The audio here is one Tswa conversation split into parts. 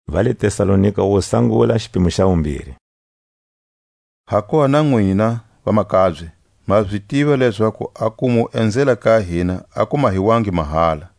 A ntiro wa Paule le Tesalonika. Hakuva na nwina, vamakabye, ma zi tiva lezaku a ku mu enzela ka hina a ku mahiwangi mahala.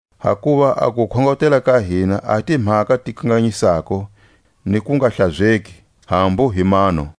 Hakuva a kukhongotela ka hina a hi timhaka ti kanganyisako ni kungahlazeki, hambu hi mano.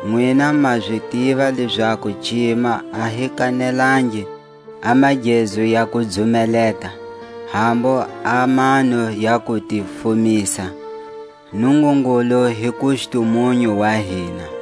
Nwina ma zi tiva lezaku cima a hi kanelangi a magezu ya ku dzumeleta, hambu a mano ya ku ti fumisa; Nungungulu hi kustumunyu wa hina.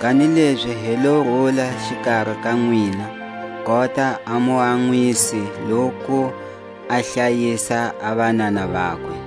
Kanilezi hi lo rula xikari ka nwina, kota a muanwisi loku a hlayisa a vanana vakwe.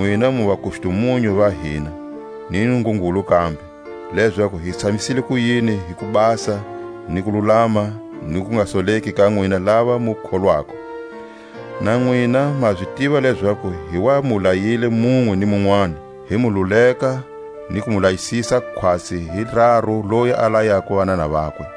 Nwina mu vakustumunyu va hina, ni Nungungulu kambe, lezaku hi tshamisile kuyini hi kubasa ni kululama ni kungasoleki ka nwina lava mu kholwako. Na nwina ma zi tiva lezaku hi wa mu layile munwe ni munwani, hi mu luleka ni ku mu layisisa khwatsi hi raru loyi a layako vanana vakwe.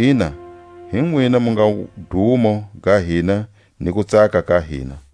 Ina, hi nwina mu nga wudumo ga hina ni kutsaka ka hina.